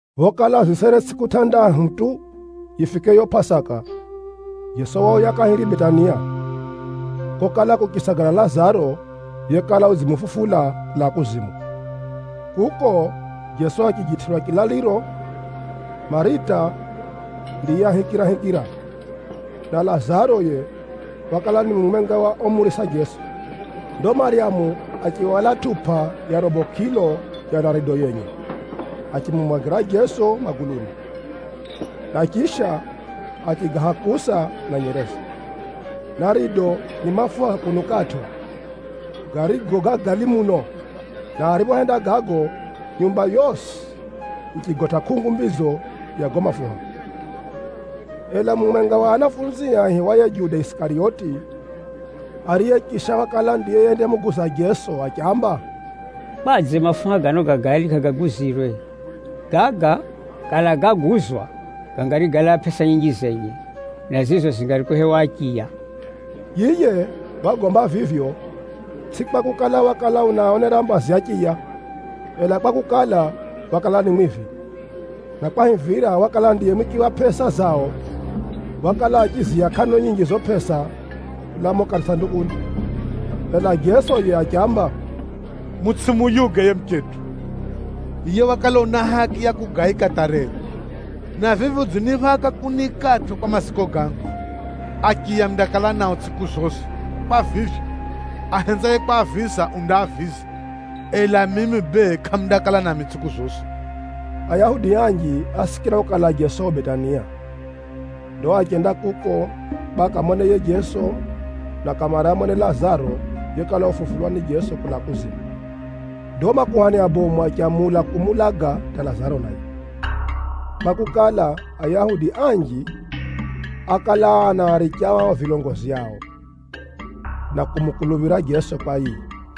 Phokala zisere tsʼiku tʼandahu tu yifike yo Pʼasaka, Jeso wauya kahiri Betania, kokala kuchisagala Lazaro yekala udzimufufula kulaa kuzimu. Kuko Jeso achijitʼirwa chilaliro. Marita ndiye ahikirahikira, na Lazaro yiye wakala ni mumwenga wa omurisa Jeso. Ndo Maryamu achihwala tʼupa ya robo kʼilo ya narido yenye, achimumwagira Jeso maguluni, na chisha achigahakusa na nyereze. Narido ni mafuha ga kunukʼatʼo, garigo ga gali muno, na ariphohenda gago, nyumba yosi yichigotʼa kʼungu mbidzo ya gago mafuha. Ela mumwenga wa anafunzie aihiwaye Juda Isikariyoti, ariye chisha wakala ndiye yendamuguza Jeso, achiamba, “Kwadze mafuha gano ga gali kʼagaguzirwe? Gaga kala gáguzwa, gangari gálaa pʼesa nyinji zenye, na zizo zingari kuhewa achiya.” Yiye wagomba vivyo, tsʼi kwakukala, wakala unaaonera mbazi achiya, ela kwakukala, wakala ni mwivi, na kwahivira wakala ndiye mwiki wa pʼesa zao, wakala achiziiya kʼano nyinji zizo pʼesa kulaa mumo kasandukuni. Ela Jeso yiye achiamba, “Mutsʼimuyuge yiye muchetʼu! Yiye wakala una haki ya kugaika hata rero, na vivi udziniphaka kuniikatʼo kwa maziko gangu. Achiya mundakala nao tsʼiku zosi. Kwa vivyo, ahenzaye kwaaviza, undaaviza, ela mimi bee kʼamundakala nami tsʼiku zosi.” Ayahudi anji ásikira kukala Jeso yu Betania. Ndo achenda kuko kwa akamone yiye Jeso, na kamare amone Lazaro yekala ufufulwa ni Jeso kulaa kuzimu. Ndo makuhani abomu achamula kumuulaga hata Lazaro naye, kwakukala, Ayahudi anji ákala anaaricha ao vilongozi ao, na kumukuluphira Jeso kwa yiye.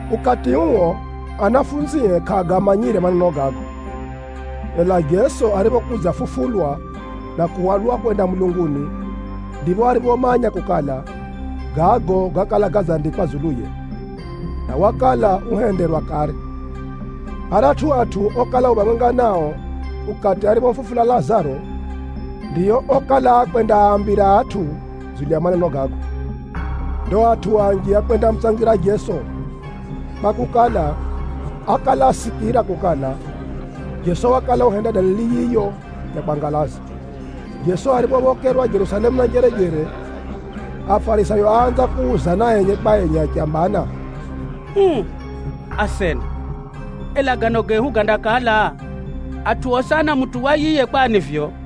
Ukati uo, anafunzie kʼaagamanyire maneno gago. Ela Jeso ariphokudzafufulwa na kuhwalwa kwenda mulunguni, ndipho ariphomanya kukala, gago gákala gadzandikwa dzuluye, na wakala uhenderwa kare. Aratʼu atʼu okala yu phamwenga nao ukati ariphomufufula Lazaro, ndio okala akwendaambira atʼu dzulu ya maneno gago. Ndo atʼu anji ákwendamutsangira Jeso, kwakukala, ákala asikira kukala, Jeso wakala uhenda dalili yiyo ya kwangalaza. Jeso ariphophokerwa Jerusalemu na njerejere, Afarisayo áanza kuuzana enye kwa enye achambana, “Uu asena, ela gano gehu gandakala? Atʼu osi anamutuwa yiye kwani vivyo!”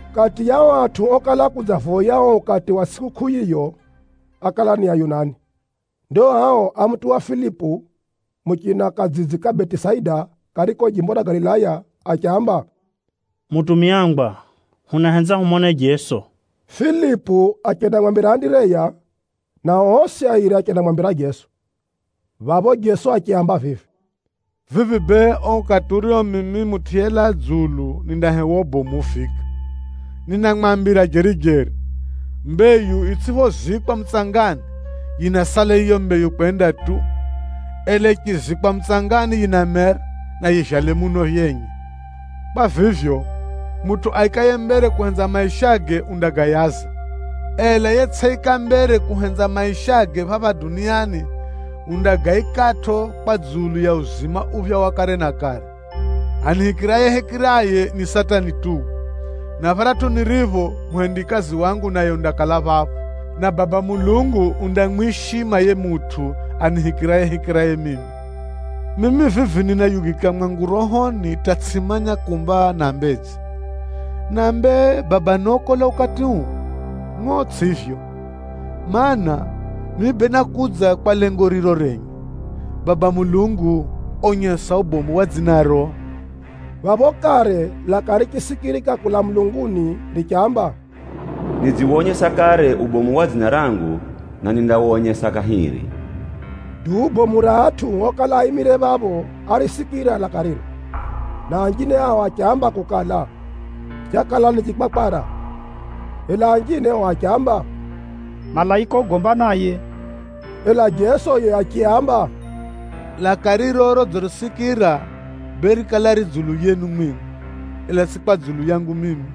Kati ya ao atʼu okala akudzavoya uo ukati wa tsʼikukʼuu yiyo, ákala ni Ayunani. Ndo ao ámutuwa Filipu, muchina kadzidzi ka Betisaida kariko jimbo ra Galilaya, achiamba, “Mutumiangwa, hunahenza humone Jeso.” Filipu achendamwambira Andireya, nao osi airi achendamwambira Jeso. Phapho Jeso achiaamba vivi, “Vivi bee uo ukati urio mimi Mutʼu yelaa dzulu nindahewa ubomu ufika. Ninamwambira jeri-jeri, mbeyu yitsʼiphozikwa mutsangani, yinasala yiyo mbeyu kwenda tu. Ela yichizikwa mutsangani yinamera, na yivyale muno yenye. Kwa vivyo, mutʼu aikaye mbere kuhenza maishage undagayaza, ela yetsʼiika mbere kuhenza maishage phapha duniani, undagaikatʼo kwa dzulu ya uzima uphya wa kare na kare. Anihikirayehikiraye, ni seti anituwe, na pharatʼu niripho, muhendikazi wangu naye undakala phapho. Na Baba Mulungu undamwishima yiye mutʼu anihikirayehikiraye mimi. “Mimi vivi ninayugika mwangu rohoni hata tsʼimanya kumba nambedze. Nambe, ‘Baba nokola ukati uu?’ Ngʼo tsʼivyo. Maana, mimi bee nákudza kwa lengo riro renye. Baba Mulungu, onyesa ubomu wa dzinaro.” Phapho kare laka richisikirika kulaa mulunguni richamba, “Nidziwonyesa kare ubomu wa dzina rangu, na nindawonyesa kahiri.” Duu bomu ra atʼu okala aimire phapho árisikira laka riro, na anjine ao achiamba kukala, chakala ni chikwakwara. Ela anjine ao achiamba, “Malaika ugomba naye!” Ela Jeso yiye achiaamba, “Laka riro rodzirisikira bee rikala ri dzulu yenu mwimwi, ela tsʼi kwa dzulu yangu mimi.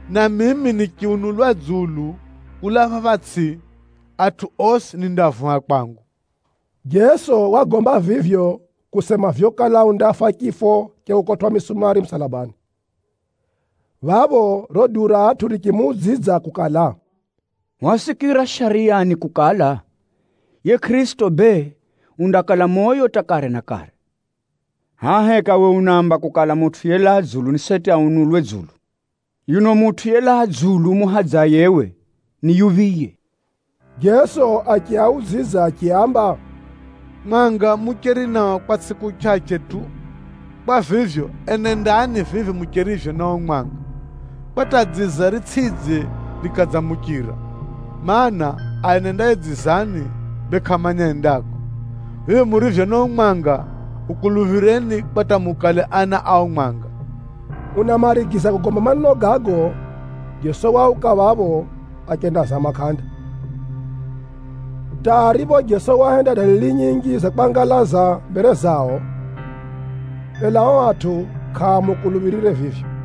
Na mimi nichiunulwa dzulu kulaa phapha tsʼi, atʼu osi nindaavuha kwangu.” Jeso wagomba vivyo kusema vyokala undafa chifo cha kukotwʼa misumari musalabani. Phapho riro duu ra atʼu richimuudzidza kukala, “Hwasikira Shariyani kukala, ‘Yiye Kʼirisito bee undakala moyo hata kare na kare.’ Hʼaya heka uwe unaamba kukala, Mutʼu yelaa dzulu ni seti aunulwe dzulu? Yuno Mutʼu yelaa dzulu umuhadzaye uwe ni yuphiye?” Jeso achiaudzidza achiaamba, “Mwanga mucheri nao kwa tsʼiku chʼachʼe tu. Kwa vivyo, enendani vivi mucherivyo na uo mwanga, kwa hata dziza ritsʼidze rikadzamuchira, mana, aenendaye dzizani, bee kʼamanya endako. Vivi murivyo na uo mwanga, ukuluphireni kwa hata mukale ana a uo mwanga.” Unamarigiza kugomba maneno gago, Jeso wauka phapho achendazama kʼanda. Hata aripho Jeso wahenda dalili nyinji za kwangalaza mbere zao, ela ao atʼu kʼaamukuluphirire vivyo,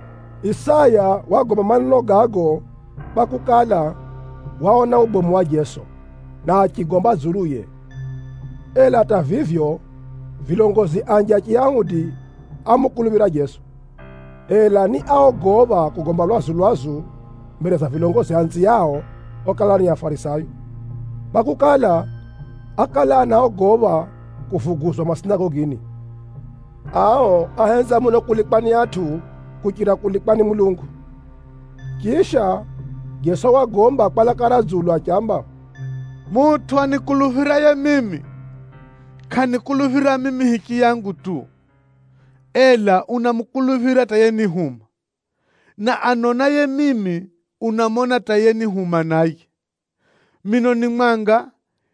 Isaya wagomba maneno gago kwakukala, waona ubomu wa Jeso, na achigomba dzuluye. Ela hata vivyo, vilongozi anji a Chiyahudi ámukuluphira Jeso, ela ni áogopha kugomba lwazu-lwazu mbere za vilongozi anziao okala ni Afarisayo, kwakukala, ákala anaogopha kuvuguzwa masinagogini. Ao áhenza muno kulikwa ni atʼu kuchira kulikwa ni Mulungu. Chisha, Jeso wagomba kwa laka ra dzulu achiamba, “Mutʼu anikuluphiraye mimi, kʼanikuluphira mimi hichiyangu tu, ela unamukuluphira hata yenihuma. Na anonaye mimi, unamona hata yenihuma naye. Mino ni mwanga,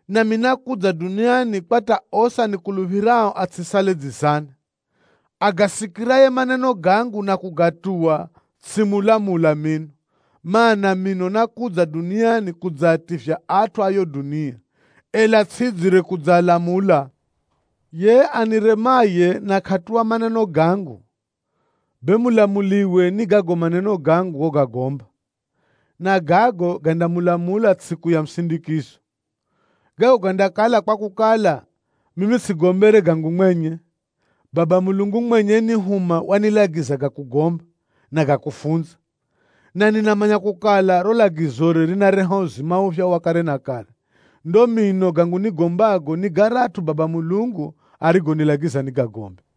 nami nákudza duniani kwa hata osi anikuluphirao atsʼisale dzizani. Agasikiraye maneno gangu na kʼagatuwa tsʼimulamula mino, mana, mino nákudza duniani kudzaativya atʼu a yiyo dunia, ela tsʼidzire kudzaalamula. Yiye aniremaye na kʼatuwa maneno gangu, bee mulamuliwe ni gago maneno gangu gogagomba, na gago gandamulamula tsʼiku ya musindikizo. Gago gandakala kwakukala, mimi tsʼigombere gangu mwenye. Baba Mulungu mwenye yenihuma wanilagiza ga kugomba, na ga kufunza. Na ninamanya kukala, riro lagizore rinareha uzima uphya wa kare na kare. Ndo mino gangu nigombago ni garatʼu Baba Mulungu arigonilagiza nigagombe.”